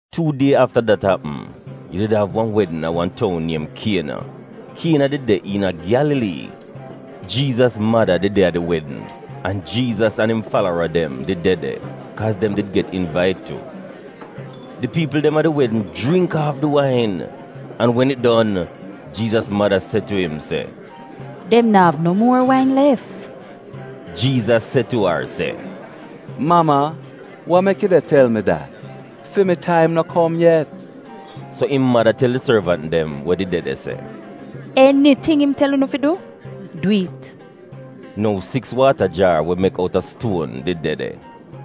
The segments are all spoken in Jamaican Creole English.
Tuu die afta dat apm, yu did av wan wedn a wan toun niem Kiena. Kiena did de iina Gyalalii. Jiizas mada did de a di wedn, an Jiizas an im falara dem did de de, kaa dem did get invait tu. Di piipl dem a di wedn jringk aaf di wain, an wen it don, Jiizas mada se tu im se, “Dem na'av no muor wain lef.” Jiizas se tu ar se, “Mama, wa mek yu de tel mi dat? Fi mi taim no kom yet.” So im mada tel di sorvant dem we did de de se, “Eniting im tel unu fi du, dwi'it.” Nou siks waata jaar we mek outa stuon did de de.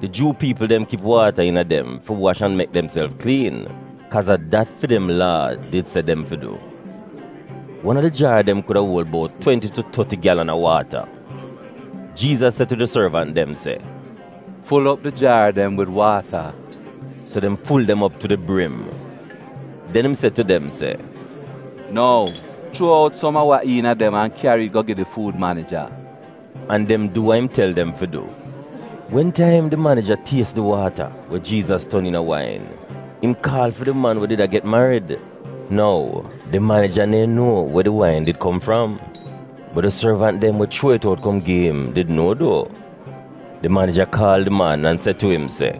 Di Juu piipl dem kip waata iina dem fi wash an mek demself kliin, kaaz a dat fi dem Laa did se dem fi du. Wan a di jaar dem kuda uol bout twenti tu toti gyalan a waata. Jiizas se tu di sorvant dem se, “Ful op di jaar dem wid waata.” So dem ful dem op tu di brim. Den im se tu dem se, “Nou, chuo out som a wa iina dem an kyari it go gi di fuud manija.” An dem du wa im tel dem fi du. Wen taim di manija ties di waata we Jiizas ton iina wain, im kaal fi di man we did a get marid. Nou, di manija neehn nuo we di wain did kom fram. (Bot di sorvant dem we chuo it out kom gi im did nuo duo.) Di manija kaal di man an se tu im se,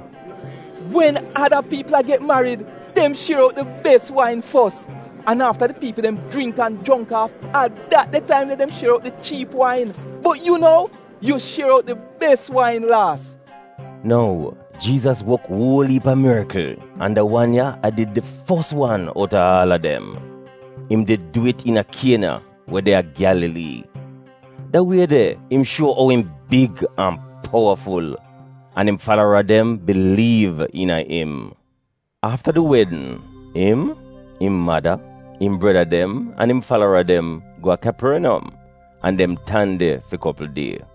“Wen ada piipl a get marid, dem shier out di bes wain fos. An afta di piipl dem jringk an jongk aaf, a dat de taim de dem shier out di chiip wain. Bot yu nou, yu shier out di bes wain laas!” Nou, Jiizas wok uol iip a mirikl an da wan ya a did di fos wan outa aal a dem. Im did du it iina Kiena we de a Gyalalii. Da wie de, im shuo ou im big an powaful. An im falara dem biliiv iina im. Afta di wedn, im, im mada, im breda dem an im falara dem go a Kyaporniyom, an dem tan de fi kopl die.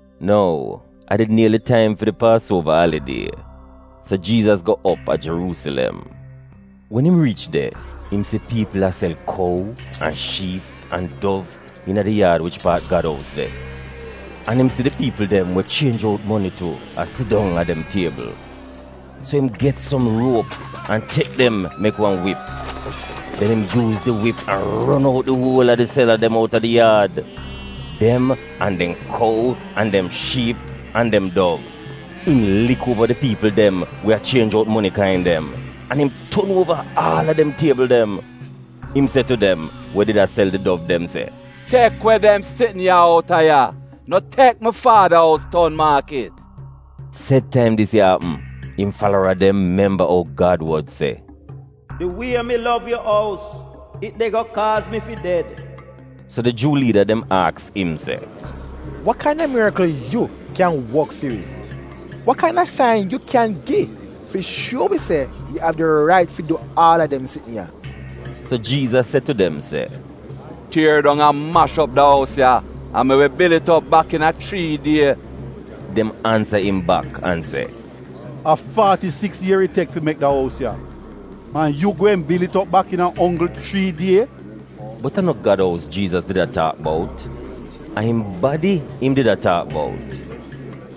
Nou, a did nieli taim fi di Paasuova alidie, so Jiizas go op a Jeruusilem. Wen im riich de, im si piipl a sel kou an shiip an dov iina di yaad wich paat Gad ous de. An im si di piipl dem we chienj out moni tu a sidong a dem tiebl. So im get som ruop an tek dem mek wan wip. Den im yuuz di wip an ron out di uol a di sela dem outa di yaad: dem an dem kou an dem shiip an dem dov. Im lik uova di piipl dem we a chienj out moni kain dem, an im ton uova aal a dem tiebl dem. Im se tu dem we did a sel di dov dem se, “Tek we dem sitn ya outa ya! No tek mi Faada ous ton maakit!” Sed taim dis ya apm, im falara dem memba ou Gad wod se, “Di wie mi lov yu ous, it de go kaaz mi fi ded.” So di Juu liida dem aks im se, “Wa kain-a mirikl yu kyan wok fi wi? Wa kain-a sain yu kyan gi fi shuo wi se yu av di rait fi du aal a dem sitn ya?” So Jiizas se tu dem se, “Tier dong an mash op da ous ya, an mi wi bil it op bak iina chrii die.” Dem ansa im bak an se, “A faati-siks ier it tek fi mek da ous ya, an yu gweehn bil it op bak iina onggl chrii die?” Bot a no Gad ous Jiizas did a taak bout. A im badi im did a taak bout.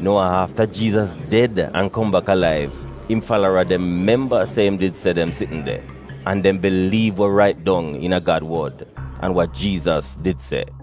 Nou a afta Jiizas ded an kom bak alaiv im falara dem memba se im did se dem sitn de. An dem biliiv wa rait dong iina Gad wod an wa Jiizas did se.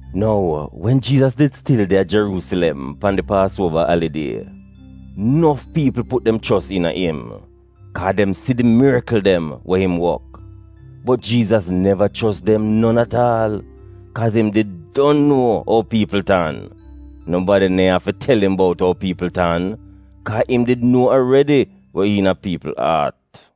Nou, wen Jiizas did stil de a Jeruusilem pan di Paasuova alidie, nof piipl put dem chos iina im, kaa dem si di mirikl dem we im wok. Bot Jiizas neva chos dem non at aal, kaaz im did don nuo ou piipl tan. Nobadi neehn afi tel im bout ou piipl tan, kaa im did nuo aredi we iina piipl aat.